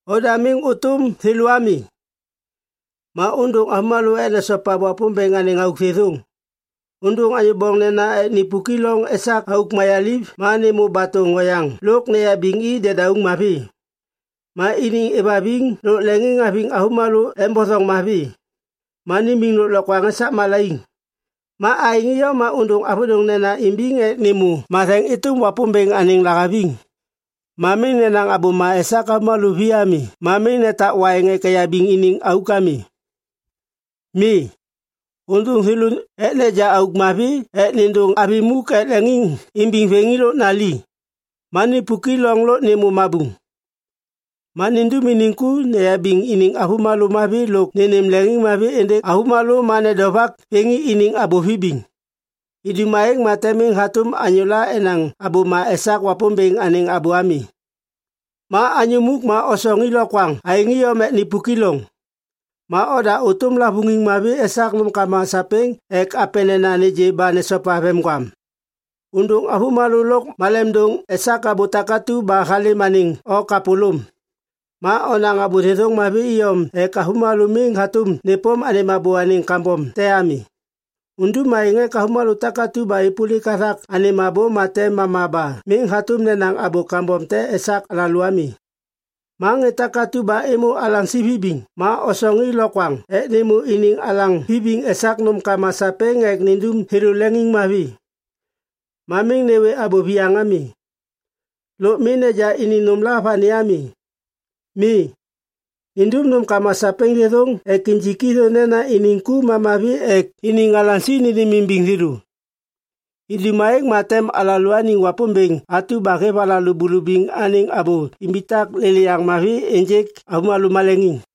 Oda miŋ ôtôm thêlô ami. Ma ôndôŋ avômalô ek nesopa Wapômbêŋ anêŋ auk thêthôŋ. Ôndôŋ anyô boŋnena ek nipuki loŋ esak auk mayaliv ma nêmô batôŋ oyaŋ lôk neyabiŋ i dedauŋ mavi. Ma iniŋ êvhaviŋ lôk leŋiŋhaviŋ avômalô embothoŋ mavi. Ma nimiŋ lôklokwaŋ esak malaiŋ. Ma aêŋ iyom ma ôndôŋ avôdôŋnena imbiŋ ek nêmô matheŋ êtôm Wapômbêŋ anêŋ lahaviŋ. Ma miŋ nenaŋ abôma esak avômalô vi ami ma miŋ netak waiŋ ek eyabiŋ iniŋ auk ami. Mi, ôndôŋ thêlô ek neja auk mavi ek nêndôŋ avi muk ek leŋiŋimbiŋ vêŋi lôk nali, ma nipuk i loŋ lôk nêmô mabuŋ, ma nindum iniŋ ku neyabiŋ iniŋ avômalô mavi lôk nênêm leŋiŋhaviŋ êndêŋ avômalô ma nedovak vêŋi iniŋ abô vibiŋ. Idum aêŋ ma tem miŋ hatôm anyôla enaŋ abôma esak Wapômbêŋ anêŋ abô ami. Ma anyô muk ma osoŋ i lokwaŋ aêŋ iyom ek nipuki loŋ. Ma oda ôtôm lavôŋiŋ mavi esak nômkama sapêŋ ek apenena nêgê ba nesopa vemgwam. Ôndôŋ avômalô lôk malemdôŋ esak abô takatu ba halêm anêŋ o kapôlôm. Ma onaŋ abô thêthôŋ mavi iyom ek avômalô miŋ hatôm nêpôm anêm abô anêŋ kambom te ami. Undum aêŋ ek avômalô takatu ba êpôlik hathak anêm abô ma tem mama ba miŋ hatôm nenaŋ abô kambom te esak alalô ami. Ma ŋê takatu ba êmô alaŋsi vibiŋ ma osoŋ i lokwaŋ ek nêmô iniŋ alaŋ vibiŋ esak nômkama sapêŋ ek nindum thêlô leŋiŋmavi. Ma miŋ nêwê abô viyaŋ ami. Lôk miŋ neja iniŋ nômla vani ami. Mi, nindum nômkama sapêŋ thêthôŋ ek injik thô nena iniŋ ku ma mavi ek iniŋ alaŋsi nênêmimbiŋ thêlô. Idum aêŋ ma tem alalôaniŋ Wapômbêŋ atu ba hêv alalô bulubiŋ anêŋ abô imbitak lêlêyaŋ mavi ênjêk avômalô maleŋiŋ.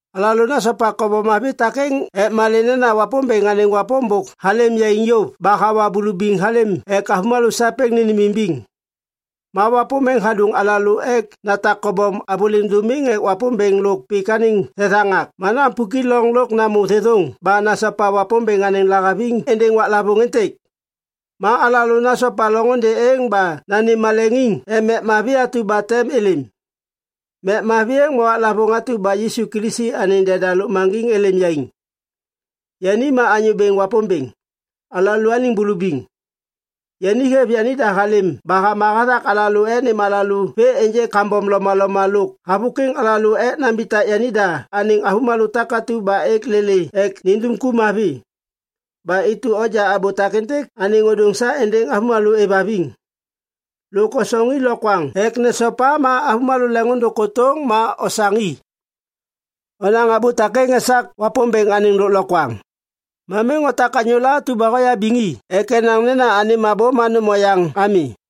Alalô nasopa kobom mavi takêŋ ek malê nena Wapômbêŋ anêŋ wapôm bôk halêm yaiŋ yôv ba hawa bulubiŋ halêm ek avômalô sapêŋ nênêmimbiŋ. Ma wapôm êŋ hadôŋ alalô ek natak kobom avôliŋ dômiŋ ek Wapômbêŋ lôk pik anêŋ thethaŋak ma napuki loŋ lôk namô thêthôŋ ba nasopa Wapômbêŋ anêŋ lahaviŋ êndêŋ waklavôŋ êntêk. Ma alalô nasopa loŋôndê êŋ ba nanêm maleŋiŋ ek mek mavi atu ba tem êlêm. Mek mavi êŋ ma waklavôŋ atu ba Yisu Kilisi anêŋ deda lôkmaŋgiŋ êlêm yaiŋ. Yani ma Anyô Bêŋ Wapômbêŋ, alalôaniŋ bulubiŋ. Yani hêv yanida halêm ba hama hathak alalô ek nêm alalô vê ênjêk kambom lomaloma lôk havôkwiŋ alalô ek nambitak yanida anêŋ avômalô takatu ba êk lêlê ek nandum ku mavi. Ba intu onja abô takêntêk anêŋ ôdôŋ sa êndêŋ avômalô êvhaviŋ. Lôk osoŋ i lokwaŋ ek nesopa ma avômalô leŋiŋôndôŋ kôtôŋ ma osaŋ i. Onaŋ abô takêŋ esak Wapômbêŋ anêŋ lôklokwaŋ. Ma miŋ otak anyôla atu ba hoyabiŋ i ek enaŋ nena anêm abô ma nôm oyaŋ ami.